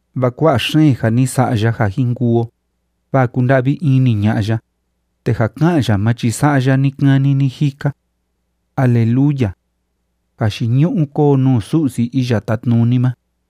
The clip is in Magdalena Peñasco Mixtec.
Vaa kua'a xeen ja ni sa'a ya ja jin kuu o, vaa kúnda'vi ini ña'a ya, te ja ká'an ya ma chi sa'a ya ni‑kani ni‑jika. ¡Aleluya! ¡Jayiñu'u kóo nuu Su'si Iya Tátnuni ma!